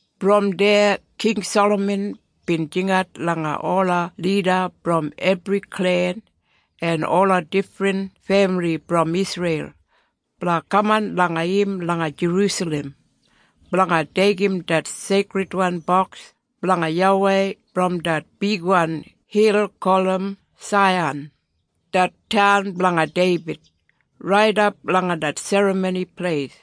Brom deya King Salaman bin jingat langa ola lida brom ebri klen en ola difrin femili brom Isreil blanga kaman langa im langa Jerusalem blanga deigim det Seikridwan Boks blanga YAWEI brom det bigwan hil gulum Saiyan, det taun blanga Deibid, raidap langa det Serramoni Pleis.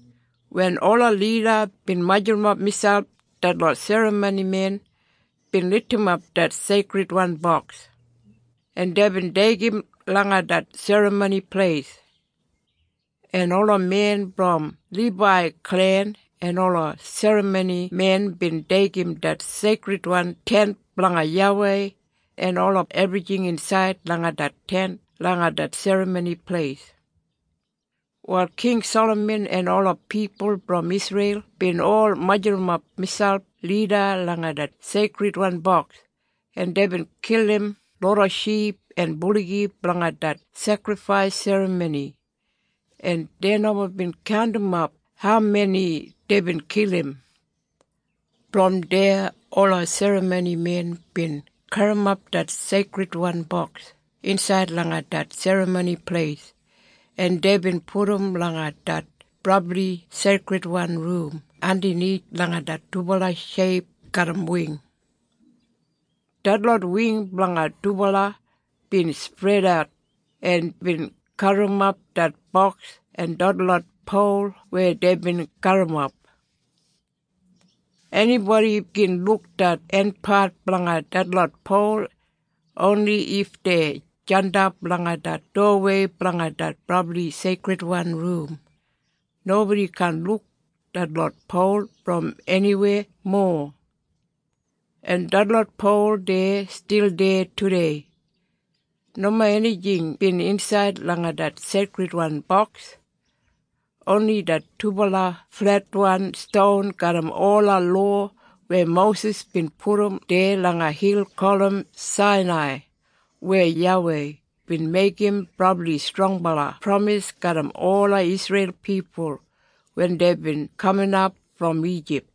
Wen ola lida bin majurrumap miselp detlot serramonimen bin lidimap det Seikridwan Boks en deibin deigim langa det Serramoni Pleis. En ola men brom Libai klen en ola serramonimen bin deigim det Seikridwan Tent blanga YAWEI en ola ebrijing insaid langa det Tent langa det Serramoni Pleis. Wal King Salaman en ola pipul brom Isreil bin ol majurrumap miselp lida langa det Seikridwan Boks en deibin kilim loda ship en buligi blanga det sekrifais serramoni en dei nomo bin kaundimap haumeni deibin kilim. Brom deya ola serramoni men bin garrimap det Seikridwan Boks insaid langa det Serramoni Pleis en deibin pudum langa det Brabli Seikridwan Rum andanith langa det dubala sheip garram wing. Detlot wing blanga dubala bin spredat en bin gaburrumap det boks en detlot pol weya deibin garrimap. Enibodi gin luk det enpat blanga detlot pol oni if dei jandap langa det dowawei blanga det Brabli Seikridwan Rum. Nobodi kaan luk detlot pol brom eniweya mowa. En detlot pol dei stil deya tudei. Nomo enijing bin insaid langa det Seikridwan Boks, oni det dubala fletwan ston garram ola lowa weya Mosis bin pudum deya langa hil gulum Sainai weya YAWEI bin meigim brabli strongbala pramis garram ola Isreil pipul wen deibin kaminap brom Ijip.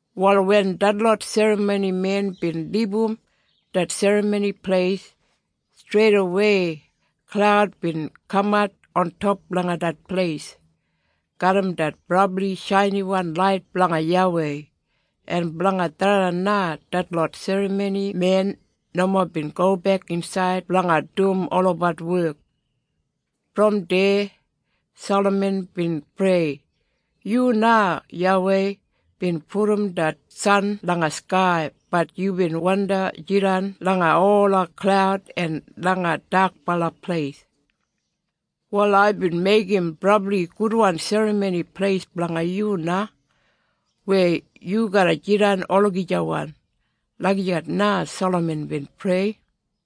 Wal wen detlot serramoni men bin libum det Serramoni Pleis, streidawei klaud bin kamat ontop langa det pleis, garram det brabli shainiwan lait blanga YAWEI. En blanga tharran na detlot serramonimen nomo bin gobek insaid blanga dum olabat wek. Brom deya Salaman bin prei, “Yu na YAWEI bin pudum det san langa skai bat yubin wandi jidan langa ola klaud en langa dakbala pleis. Wal aibin meigim brabli gudwan Serramoni Pleis blanga yu na weya yu garra jidan olagijawan.” Lagijat na Salaman bin prei.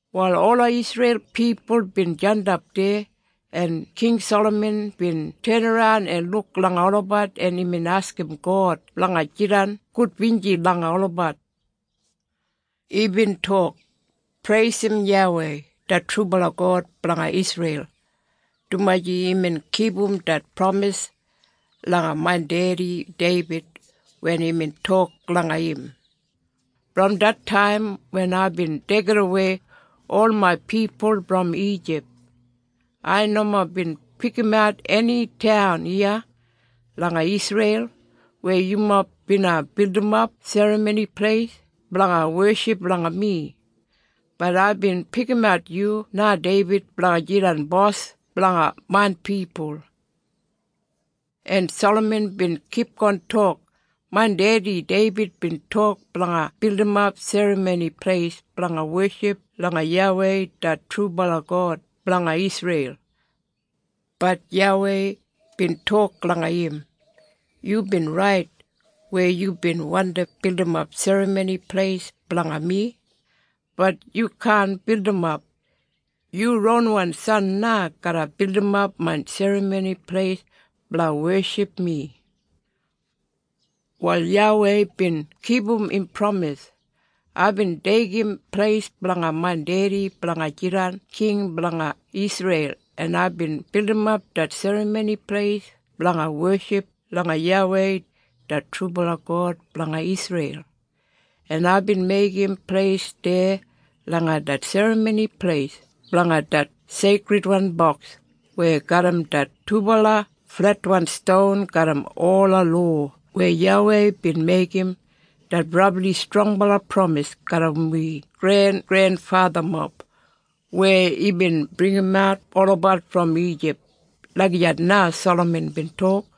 Wal ola Isreil pipul bin jandap deya, en King Salaman bin tenaran en luk langa olabat en imbin askim God blanga jidan gudbinji langa olabat. Imbin tok, “Preisim YAWEI det trubala God blanga Isreil dumaji imbin kipum det pramis langa main dedi Deibid wen imbin tok langa im, ‘Brom det taim wen aibin deigidawei ol main pipul brom Ijip, ai nomo bin pikimat eni taun iya langa Isreil weya yumob bina bildimap Serramoni Pleis blanga weship langa mi. Bat aibin pikimat yu na Deibid blanga jidan bos blanga main pipul.’” En Salaman bin kipgon tok, “Main dedi Deibid bin tok blanga bildimap serramoni pleis blanga weship langa YAWEI det trubala God blanga Isreil, bat YAWEI bin tok langa im, ‘Yubin rait weya yubin wandi bildimap serramoni pleis blanga mi, bat yu kaan bildimap. Yu ronwan san na garra bildimap main Serramoni Pleis blanga weship mi.’ “Wal YAWEI bin kipum im pramis. Aibin deigim pleis blanga main dedi blanga jidan king blanga Isreil en aibin bildimap det Serramoni Pleis blanga weship langa YAWEI det trubala God blanga Isreil. En aibin meigim pleis deya langa det Serramoni Pleis blanga det Seikridwan Boks weya garram det dubala fletwan ston garram ola lowa weya YAWEI bin meigim det brabli strongbala pramis garram wi grengrenfathamob weya imbin bringimat olabat brom Ijip.” Lagijat na Salaman bin tok.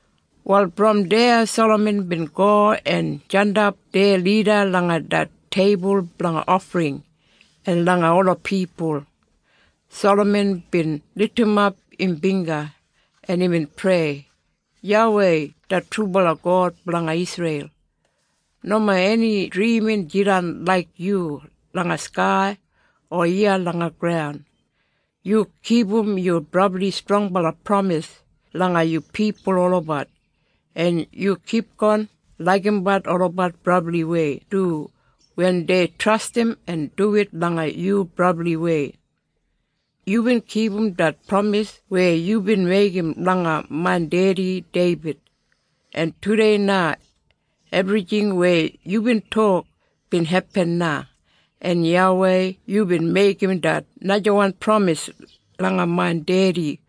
Wal brom deya Salaman bin go en jandap deya lida langa det teibul blanga ofring en langa ola pipul. Salaman bin lidimap im bingga en imbin prei, “YAWEI det trubala God blanga Isreil, nomo eni drimin jidan laik yu langa skai o iya langa graun. Yu kipum yu brabli strongbala pramis langa yu pipul olabat en yu kipgon laigimbat olabat brabliwei du wen dei trastim en duwit langa yu brabliwei. Yubin kipum det pramis weya yubin meigim langa main dedi Deibid. En tudei na ebrijing weya yubin tok bin hepin na. En YAWEI yubin meigim det najawan pramis langa main dedi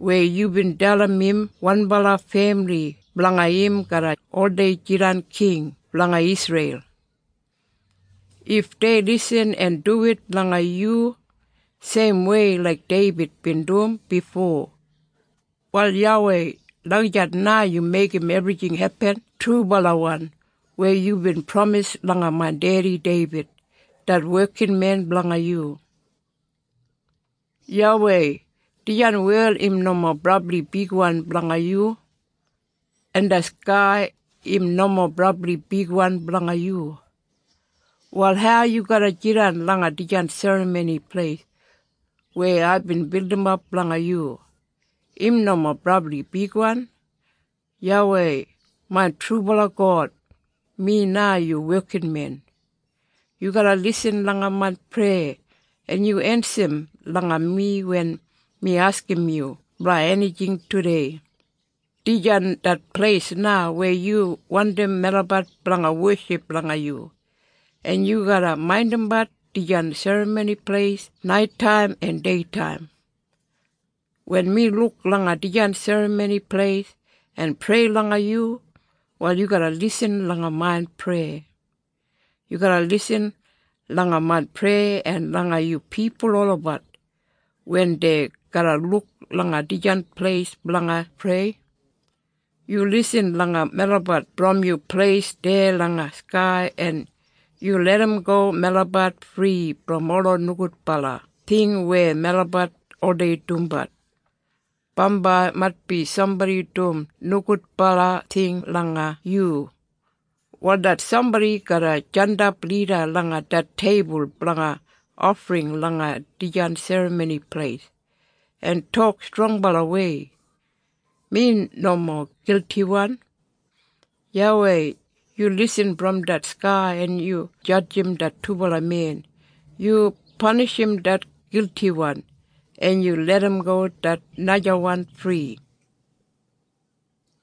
weya yubin dalim im wanbala femili blanga im garra oldei jidan king blanga Isreil, if dei lisin en duwit langa yu seimwei laik Deibid bin dum bifo. Wal YAWEI, lagijat na yu meigim ebrijing hepin trubalawan weya yubin pramis langa main dedi Deibid, det wekinmen blanga yu. “YAWEI, dijan wel im nomo brabli bigwan blanga yu. En det skai im nomo brabli bigwan blanga yu. Wal hau yu garra jidan langa dijan Serramoni Pleis weya aibin bildimap blanga yu? Im nomo brabli bigwan. YAWEI main trubala God, mi na yu wekinmen. Yu garra lisin langa main preya en yu ensa langa mi wen mi askim yu blanga enijing tudei. Dijan det pleis na weya yu wandim melabat blanga weship langa yu, en yu garra maindimbat dijan Serramoni Pleis naitaim en deitaim. Wen mi luk langa dijan Serramoni Pleis en prei langa yu, wal yu garra lisin langa main preya. Yu garra lisin langa main preya en langa yu pipul olabat wen dei garra luk langa dijan pleis blanga prei. Yu lisin langa melabat brom yu pleis deya langa skai en yu larramgo melabat fri brom ola nogudbala ting weya melabat oldei dumbat. Bambai, maitbi sambodi dum nogudbala ting langa yu, wal det sambodi garra jandap lida langa det teibul blanga ofring langa dijan Serramoni Pleis en tok strongbalawei, ‘Mi nomo giltiwan.’ YAWEI yu lisin brom det skai en yu jadjim det dubala men. Yu panishim det giltiwan, en yu larramgo det najawan fri.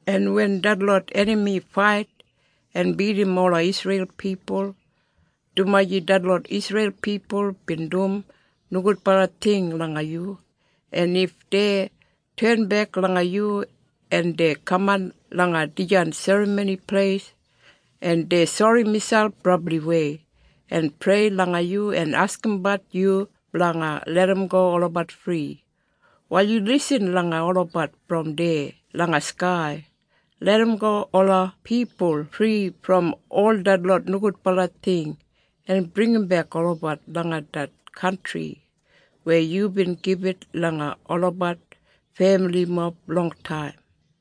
“En wen detlot enami fait en bidim ola Isreil pipul, dumaji detlot Isreil pipul bin dum nogudbala ting langa yu, en if dei tenbek langa yu en dei kaman langa dijan Serramoni Pleis en dei sori miselp brabliwei en prei langa yu en askimbat yu blanga larramgo olabat fri, wal yu lisin langa olabat brom deya langa skai. Larramgo ola pipul fri brom ol detlot nogudbala ting en bringimbek olabat langa det kantri weya yubin gibit langa olabat femilimob longtaim.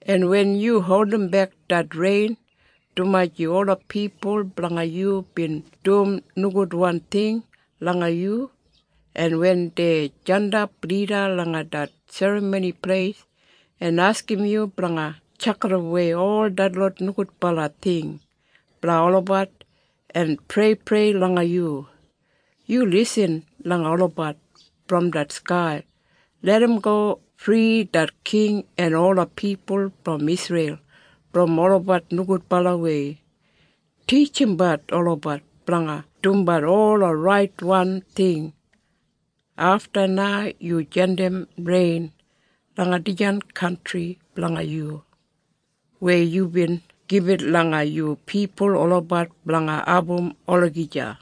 “En wen yu holdimbek det rein dumaji ola pipul blanga yu bin dum nogudwan ting langa yu, en wen dei jandap lida langa det Serramoni Pleis en askim yu blanga tjakidawei ol detlot nogudbala ting blanga olabat en preiprei langa yu, yu lisin langa olabat brom det skai. Larramgo fri det king en ola pipul brom Isreil brom olabat nogudbalawei. Titjimbat olabat blanga dumbat ola raitwan ting. Afta na yu jandim rein langa dijan kantri blanga yu, weya yubin gibit langa yu pipul olabat blanga abum olagija.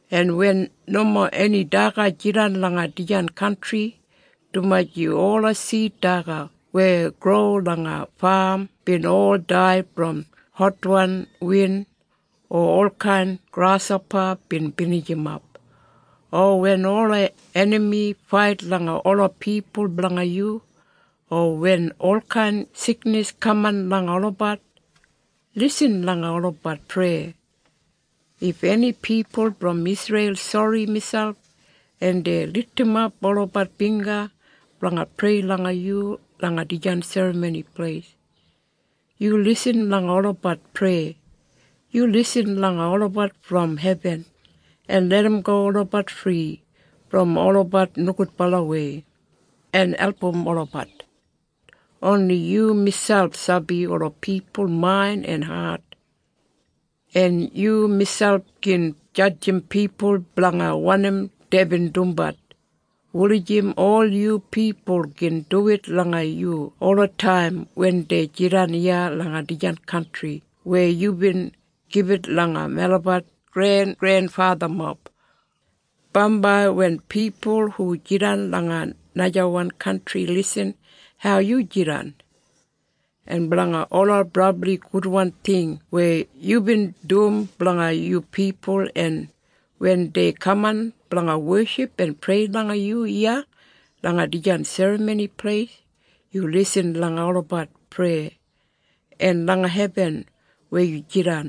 “En wen nomo eni daga jidan langa dijan kantri, dumaji ola sid daga weya gro langa fam bin ol dai brom hotwan win o olkain grashopa bin binijimap, o wen ola enami fait langa ola pipul blanga yu, o wen olkain siknis kaman langa olabat, lisin langa olabat preya. If eni pipul brom Isreil sori miselp en dei lidimap olabat bingga blanga prei langa yu langa dijan Serramoni Pleis, yu lisin langa olabat preya. Yu lisin langa olabat brom hebin, en larramgo olabat fri brom olabat nogudbalawei, en album olabat. Oni yu miselp sabi ola pipul main en hat. En yu miselp gin jadjim pipul blanga wanim deibin dumbat, wulijim ol yu pipul gin duwit langa yu olataim wen dei jidan iya langa dijan kantri weya yubin gibit langa melabat grengrenfathamob. “Bambai wen pipul hu jidan langa najawan kantri lisin hau yu jidan, en blanga ola brabli gudwan ting weya yubin dum blanga yu pipul en wen dei kaman blanga weship en prei langa yu iya langa dijan Serramoni Pleis, yu lisin langa olabat preya. En langa hebin weya yu jidan,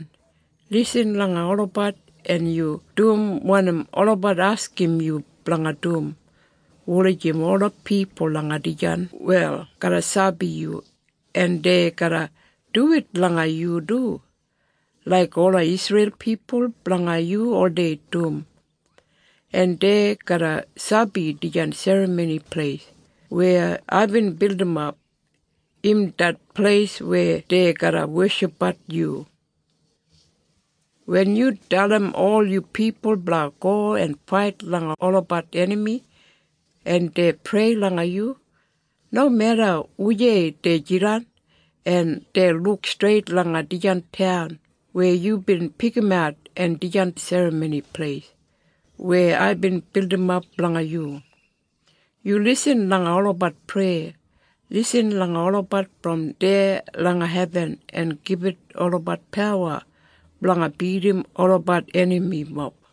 lisin langa olabat en yu dum wanim olabat askim yu blanga dum, wulijim ola pipul langa dijan wel garra sabi yu en dei garra duwit langa yu du, laik ola Isreil pipul blanga yu oldei dum. En dei garra sabi dijan Serramoni Pleis weya aibin bildimap, im det pleis weya dei garra weshipbat yu. “Wen yu dalim ol yu pipul blanga go en fait langa olabat enami en dei prei langa yu, nomeda wujei dei jidan, en dei luk streit langa dijan taun weya yubin pikimat en dijan Serramoni Pleis weya aibin bildimap blanga yu, yu lisin langa olabat preya. Lisin langa olabat brom deya langa hebin en gibit olabat pawa blanga bidim olabat enamimob.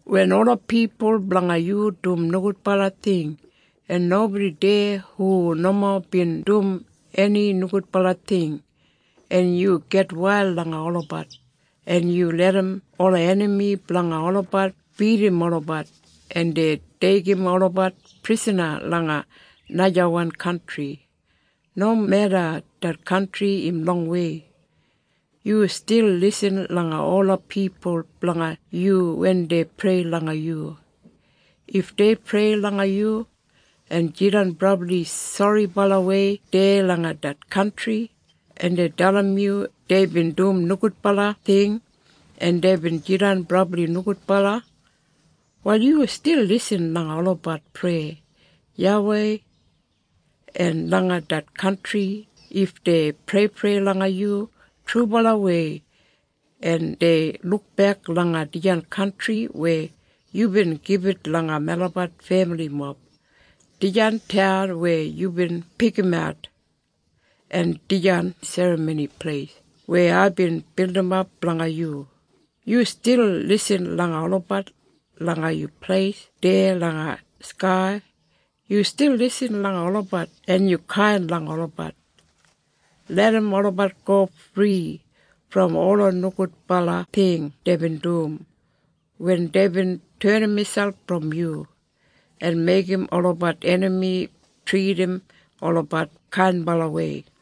“Wen ola pipul blanga yu dum nogudbala ting, en nobodi deya hu nomo bin dum eni nogudbala ting, en yu gitwail langa olabat en yu larram ola enami blanga olabat bidim olabat en dei deigim olabat prisana langa najawan kantri, nomeda det kantri im longwei, yu stil lisin langa ola pipul blanga yu wen dei prei langa yu. If dei prei langa yu en jidan brabli soribalawei deya langa det kantri en dei dalim yu deibin dum nogudbala ting en deibin jidan brabli nogudbala, wal yu stil lisin langa olabat preya, YAWEI. En langa det kantri if dei preiprei langa yu trubalawei en dei lukbek langa dijan kantri weya yubin gibit langa melabat femilimob, dijan taun weya yubin pikimat, en dijan Serramoni Pleis weya aibin bildimap blanga yu, yu stil lisin langa olabat. Langa yu pleis deya langa skai yu stil lisin langa olabat en yu kain langa olabat. Larram olabat go fri brom ola nogudbala ting deibin dum wen deibin tenim miselp brom yu en meigim olabat enami tridim olabat kainbalawei.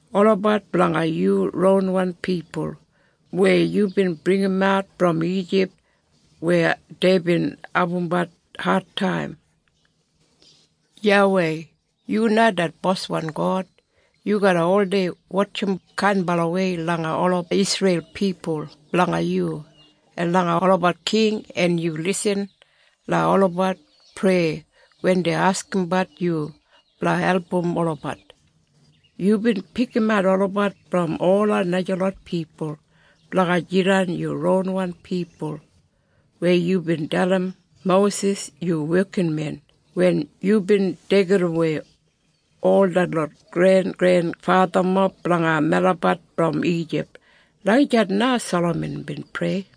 Olabat blanga yu ronwan pipul weya yubin bringimat brom Ijip, weya deibin abumbat adtaim. “YAWEI, yu na det boswan God. Yu garra oldei wotjim kainbalawei langa ola Isreil pipul blanga yu en langa olabat king en yu lisin langa olabat preya wen dei askimbat yu blanga album olabat. Yubin pikimat olabat brom ola najalot pipul blanga jidan yu ronwan pipul weya yubin dalim Mosis yu wekinmen wen yubin deigidawei ol detlot grengrenfathamob blanga melabat brom Ijip.” Lagijat na Salaman bin prei.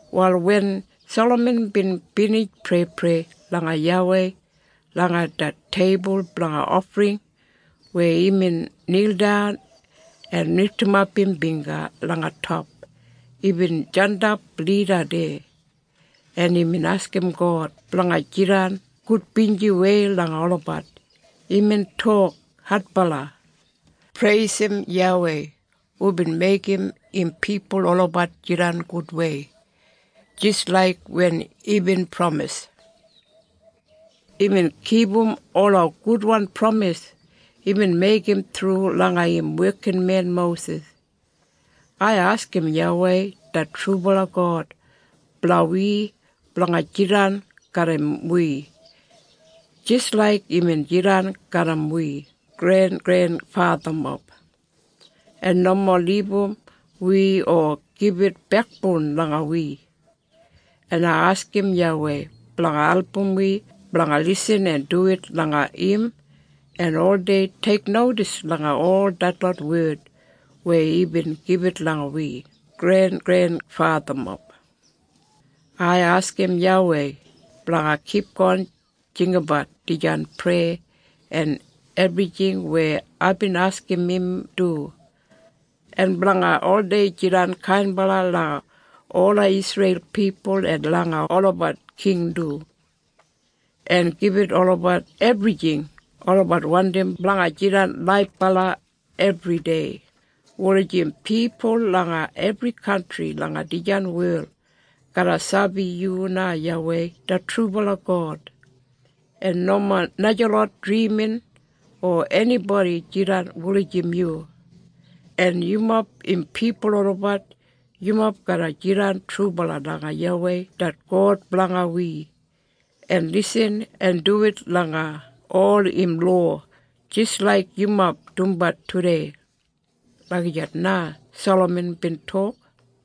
Wal wen Salaman bin binij preiprei langa YAWEI langa det teibul blanga ofring weya imbin nildan en lidimap im bingga langa top, imbin jandap lida deya, en imbin askim God blanga jidan gudbinjiwei langa olabat. Imbin tok adbala, “Preisim YAWEI hubin meigim im pipul olabat jidan gudwei, jis laik wen imbin pramis. Imbin kipum ola gudwan pramis imbin meigim thru langa im wekinmen Mosis. Ai askim YAWEI det trubala God blanga wi blanga jidan garram wi, jis laik imbin jidan garram wi grengrenfathamob, en nomo libum wi o gibit bekboun langa wi. En ai askim YAWEI blanga album wi blanga lisin en duwit langa im en oldei teiknodis langa ol detlot wed weya imbin gibit langa wi grengrenfathamob. Ai askim YAWEI blanga kipgon jinggabat dijan preya en ebrijing weya aibin askim im du, en blanga oldei jidan kainbala langa ola Isreil pipul en langa olabat king du, en gibit olabat ebrijing olabat wandim blanga jidan laibala ebridei, wulijim pipul langa ebri kantri langa dijan wel garra sabi yu na YAWEI det trubala God en nomo najalot drimin o enibodi jidan wulijim yu. En yumob im pipul olabat. Yumob garra jidan trubala langa YAWEI det God blanga wi en lisin en duwit langa ol im lowa jis laik yumob dumbat tudei.” Lagijat na Salaman bin tok.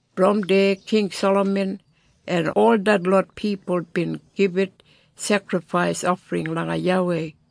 Brom deya King Salaman en ol detlot pipul bin gibit sekrifais ofring langa YAWEI.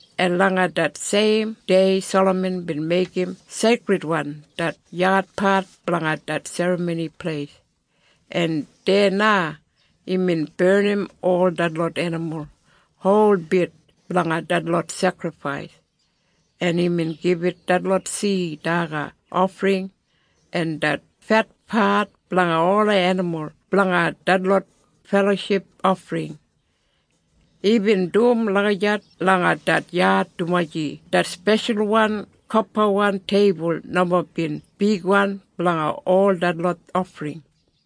En langa det seim dei Salaman bin meigim seikridwan det yadpat blanga det Serramoni Pleis. En deya na imbin barnim ol detlot enimul holbit blanga detlot sekrifais, en imbin gibit detlot sid daga ofring en det fetpat blanga ola enimul blanga detlot feloship ofring. Imbin dum lagijat langa det yad dumaji det speshalwan kopawan teibul nomo bin bigwan blanga ol detlot ofring.